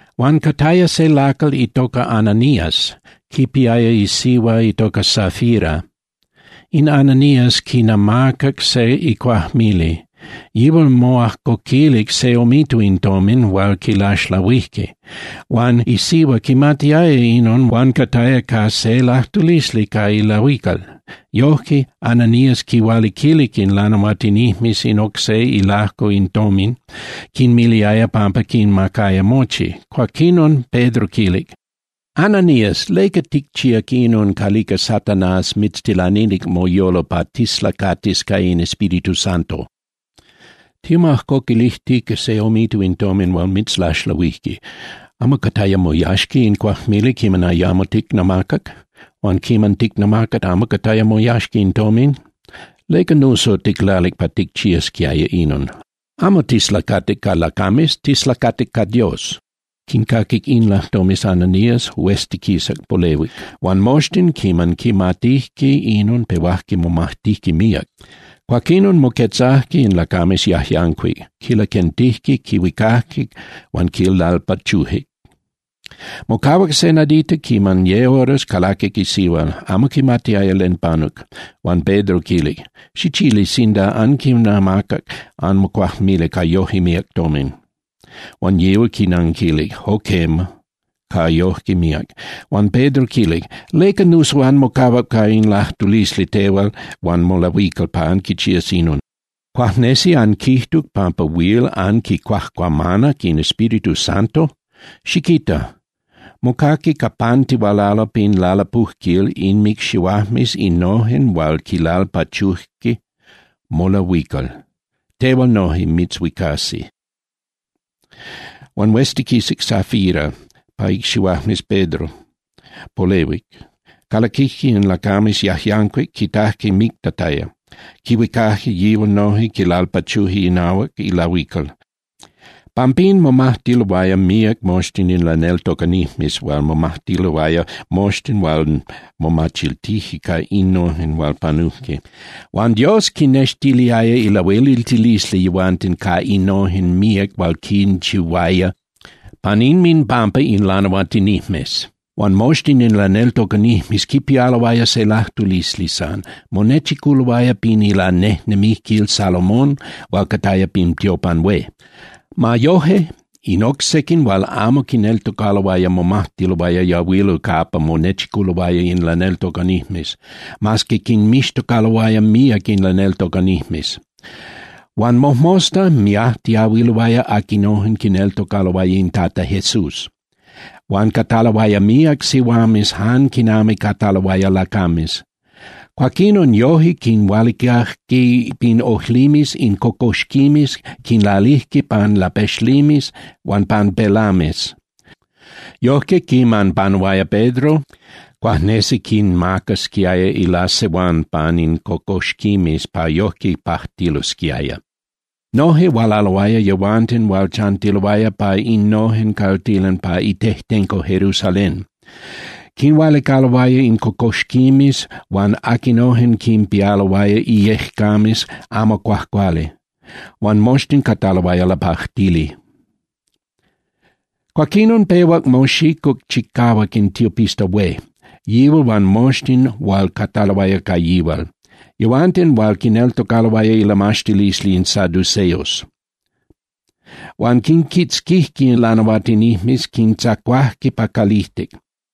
Huan cataya se lacal itoca Ananías, quipiaya isihua itoca Safira. In Ananías quinamacac se icuajmili. Yihual moajcoquilic se omito in tomin hual quilaxlahuijque. Huan isihua quimatiaya inon huan cataya ca se lajtulisli ca ilahuical. Yojque, Ananías quinhualiquilic in lanahuatinijmes in oc se ilajco in tomin, quinmiliaya pampa quinmacaya mochi. Cuaquinon Pedro quilic: —Ananías, ¿leca ticchíac inon calica Satanás mitztilanilic moyolo pa tislacatis ca in Espíritu Santo? Timoajcoquilijtica se omito in tomin hual mitzlaxlahuijque. ¿Amo cataya moyaxca in cuajmili quiman ayamo ticnamacac? Huan quiman ticnamacac, ¿amo cataya moyaxca in tomin? ¿Leca nuso ticlalic pa ticchiasquiaya inon? Amo tislacatic ca lacames, tislacatic ca Dios. Quincaquic in lajtomes Ananías, hueztiquisac, polehuic. Huan moxtin, quiman quimatijque inon pehuajque momajtijque míac. Cuaquinon moquetzajque in lacames yajyancuic, quilaquentijque, quihuicajque huan quilalpachujque. Mocahuac se nadita, quinami ye horas, calaquic isihua, amo quimatiaya len panuc. Huan Pedro quilic: —Xichili sinda anquinamacac anmocuajmili ca yoje míac tomin. Huan yihual quinanquilic: —Jo quema, ca yoje míac. Huan Pedro quilic: —¿Leca nuso anmocahuac ca in lajtulisli tehual huan molahuical pa anquichías inon? ¿Cuajnesi anquijtuc pampa huil anquicuajcuamanac in Espíritu Santo? Xiquita. Mocaqui capantihualalo pin lalapujquil inmicxihuajmes innojen hual quilalpachuje molahuical, tehual noje mitzhuicasi. Huan hueztiquisac Safira pa icxihuajmes Pedro, polehuic. Calaquijque in lacames yajyancuic, quitajque mictataya, quihuicajque yihual noje, quilalpachujque inahuac ilahuical. Pampín momajtiloaya míac moxtin in laneltocanijmes huan momajtiloaya moxtin hual momachiltijque ca innojen hual panujque. Huan Dios quinnextiliaya ilahueliltilisli yehuanten ca innojen míac hual quinchihuaya pan inminpampa in lanahuatinijmes. Huan moxtin in laneltocanijmes quipialoaya se lajtulisli san, monechiculoaya pin Ilanejnemijquil Salomón hual cataya pin tiopan hué. Ma yoje, in oc sequin hual amo quineltocaloaya momajtiloaya yahuilo capa monechiculoaya in laneltocanijmes, mas que quinmixtocaloaya míac in laneltocanijmes. Huan mojmosta miajtiahuiloaya aquinojen quineltocaloaya in Tata Jesús, huan cataloaya míac sihuames jan quinami cataloaya lacames. Cuaquinon yoje quinhualicajque pin ojlimes in cocoxquimes, quinlalijque pan lapexlimes huan pan pelames. Yojque quiman panuaya Pedro, cuajnesi quinmacasquiaya ilasehuán pan in cocoxquimes pa yojque pajtilosquiaya. Noje hualaloaya yehuanten hual chantiloaya pa innojen caltilan pa itejtenco Jerusalén. Quinhualicaloaya in cocoxquimes huan aquinojen quinpialoaya ijyecames amo cuajcuali, huan moxtin cataloaya lapajtili. Cuaquinon pehuac moxicuc chicahuac in tiopista hué, yihual huan moxtin hual cataloaya ca yihual, yehuanten hual quineltocaloaya ilamaxtilisli in saduceos. Huan quinquitzquijque in lanahuatinijmes, quintzacuajque pa calijtic.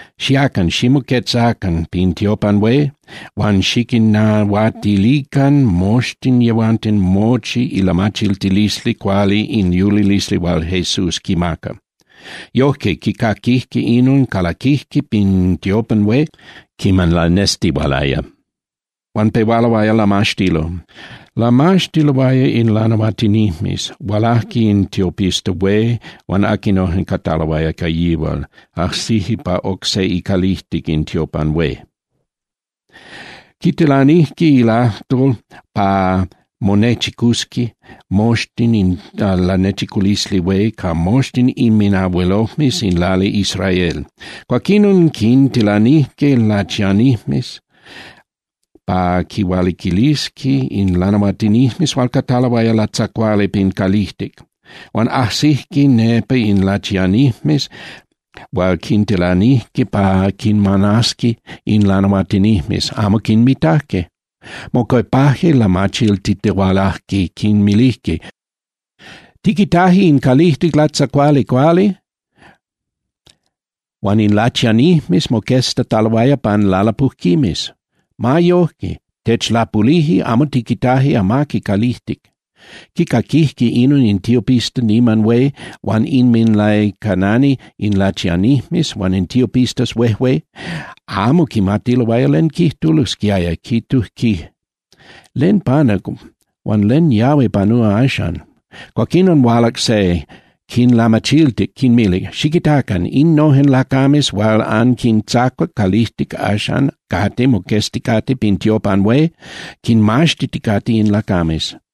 —Xiacan, ximoquetzacan pin tiopan hué huan xiquinnahuatilican moxtin yehuanten mochi ilamachiltilisli cuali in yulilisli hual Jesús quimaca. Yojque, quicaquijque inon, calaquijque pin tiopan hué quiman lanestihualaya, huan pehualoaya lamaxtilo. Lamaxtiloaya in lanahuatinijmes, hualajque in tiopista hué huan aquinojen cataloaya ca yihual, ajsijque pa oc se icalijtic in tiopan hué. Quitilanijque lajtol pa monechicusqui moxtin in Lanechiculisli Hué ca moxtin inminabuelojmes in lali Israel. Cuaquinon quintilanijque lachianijmes pa quinhualiquilisqui in lanahuatinijmes hual cataloaya latzacuali pin calijtic. Huan ajsijque nepa in lachianijmes hual quintilanijque pa quinmanasqui in lanahuatinijmes, amo quinmitajque. Mocuepajque, lamachiltitihualajque, quinmilijque: —Tiquitaje in calijtic latzacuali cuali huan in lachianijmes moqueztataloaya pan lalapujquimes. Ma yoje, techlapulije, amo tiquitaje amaqui calijtic. Quicaquijque inon in tiopista niman hué huan inminlaicanani in lachianijmes huan in tiopistas huejué, amo quimatiloaya len quijtulosquiaya, quijtujque: —¿Len panuc, huan len yahui panúa axan? Cuaquinon hualac se, quinlamachiltic, quinmilic: —Xiquitacan. Innojen lacames hual anquintzacuac calijtic axan cate moquezticate pin tiopan hué, quinmaxtiticate in lacames.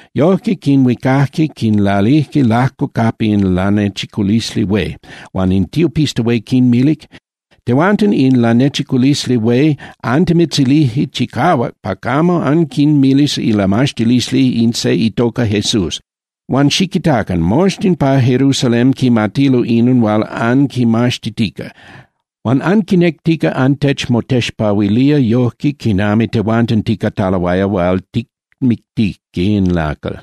Yojque quinhuicajque, quinlalijque lajco capa in Lanechiculisli Hué, huan in tiopista hué quinmilic: —Tehuanten in Lanechiculisli Hué antimitzilijque chicahuac pa camo anquinmilis ilamaxtilisli in se itoca Jesús, huan xiquitacan, moxtin pa Jerusalén quimatilo inon hual anquimaxtitica. Huan anquinectica antechmotexpahuilía yojque quinami tehuanten ticataloaya hual ticmictijque in lacal.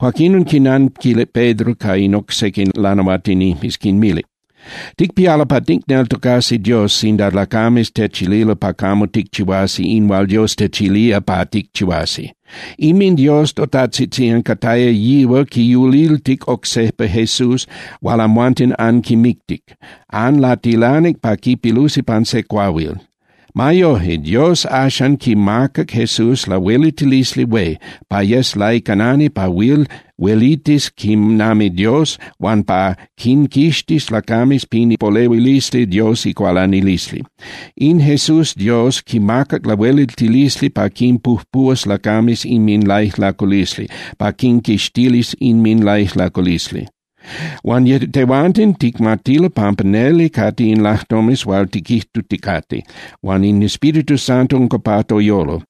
Cuaquín quinnanquilic Pedro ca in oc sequin lanahuatinijmes, quinmilic: —Ticpialo pa ticneltocasi Dios sinda lacames techililo pa camo ticchihuasi in hual Dios techilía pa ticchihuasi. InminDios totajtzitzían cataya yihual quiyuliltic oc sejpa Jesús hual amhuanten anquimictic. Anlatilanic pa quipilusi pan se cuahuil. Ma yoje Dios axan quimacac Jesús lahueliltilisli hué pa yes laicanani pa huil huelitis quinami Dios huan pa quinquixtis lacames pin ipolehuilisli Dios icualanilisli. In Jesús Dios quimacac lahueliltilisli pa quinpujpuhuas lacames inminlaijlaculisli, pa quinquixtilis inminlaijlaculisli. Huan tehuanten ticmatilo pampa neli cate in lajtomes hual tiquijtuticate, huan in Espíritu Santo unca pa toyolo.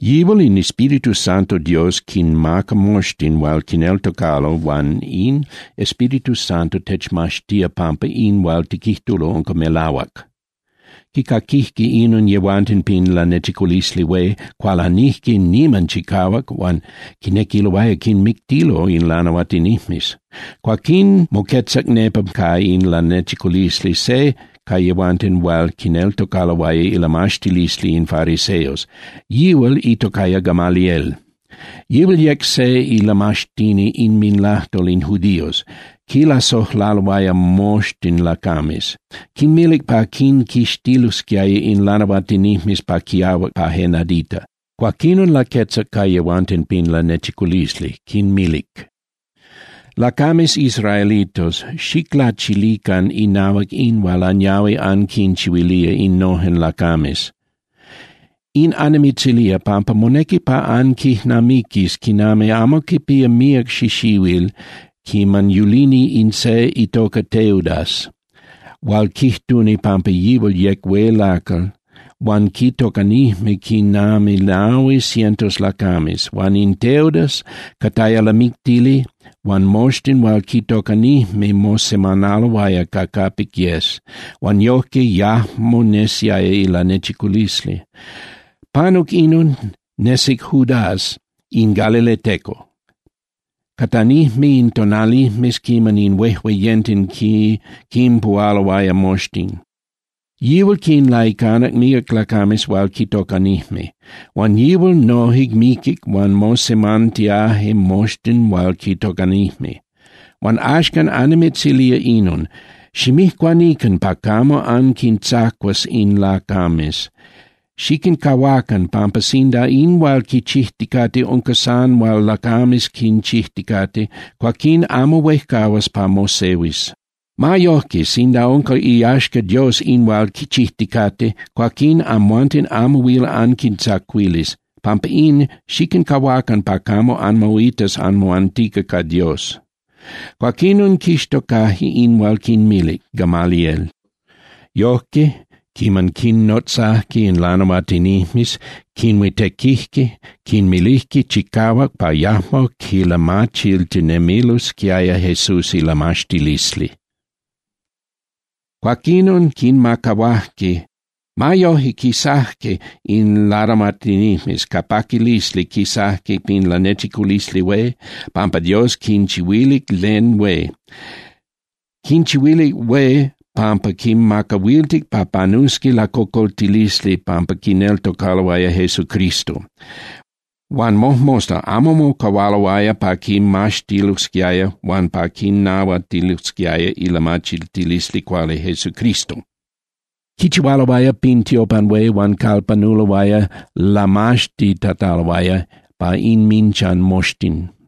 Yihual in Espíritu Santo Dios quinmaca moxtin hual quineltocalo huan in Espíritu Santo techmaxtía pampa in hual tiquijtulo unca melahuac. Quicaquijque inon yehuanten pin Lanechiculisli Hué, cualanijque niman chicahuac huan quinequiloaya quinmictilo in lanahuatinijmes. Cuaquín moquetzac nepa ca in lanechiculisli se ca yehuanten hual quineltocaloaya ilamaxtilisli in fariseos, yihual itocaya Gamaliel. Yihual yec se ilamaxtini inminlajtol in judíos, quilasojlaloaya moxtin lacames. Quinmilic pa quinquixtilosquiaya in lanahuatinijmes pa quiahuac pa je nadita. Cuaquinon laquetzac ca yehuanten pin lanechiculisli, quinmilic: —Lacames israelitos, xiclachilican inahuac in hual anyahui anquinchihuilía innojen lacames. In annimitzilía, pampa monequi pa anquijnamiquis quinami amo quipía míac xixihuil quiman yulini in se itoca Teudas hual quijtuni pampa yihual yec hué lacal huan quitocanijme quinami nahui cientos lacames. Huan in Teudas cataya lamictili huan moxtin hual quitocanijme mosemanaloaya ca capic yes, huan yojque yajmo nesiaya ilanechiculisli. Panuc inon, nesic Judas in galileteco, catanijme in tonalijmes quiman in huejueyenten quinpuhualoaya moxtin. Yihual quinlaicanac míac lacames hual quitocanijme. Huan yihual noje miquic huan mosemantiaje moxtin hual quitocanijme. Huan axcan annimitzilía inon: ximijcuanican pa camo anquintzacuas in lacames. Xiquincahuacan, pampa sinda in hual quichijticate unca san hual lacames quinchijticate, cuaquín amo huejcahuas pa mosehuis. Ma yojque, sinda unca iyaxca Dios in hual quichijticate, cuaquín amhuanten amo huil anquintzacuilis. Pampa in, xiquincahuacan pa camo anmoitas anmoantica ca Dios. Cuaquinon, quixtocajque in hual quinmilic Gamaliel. Yojque, quiman quinnotzajque in lanahuatinijmes, quinhuitequijque, quinmilijque chicahuac pa yajmo quilamachiltitinemilosquiaya Jesús ilamaxtilisli. Cuaquinon quinmacahuajque. Ma yoje, quisajque in lanahuatinijmes, ca paquilisli quisajque pin Lanechiculisli Hué, pampa Dios quinchihuilic len hué. Quinchihuilic hué pampa quinmacahuiltic pa panusqui lacocoltilisli pampa quineltocaloaya Jesucristo. Huan mojmosta amo mocahualoaya pa quimaxtilosquiaya huan pa quinahuatilosquiaya ilamachiltilisli cuali Jesucristo. Quichihualoaya pin tiopan hué huan calpanuloaya lamaxtitataloaya pa inminchan moxtin.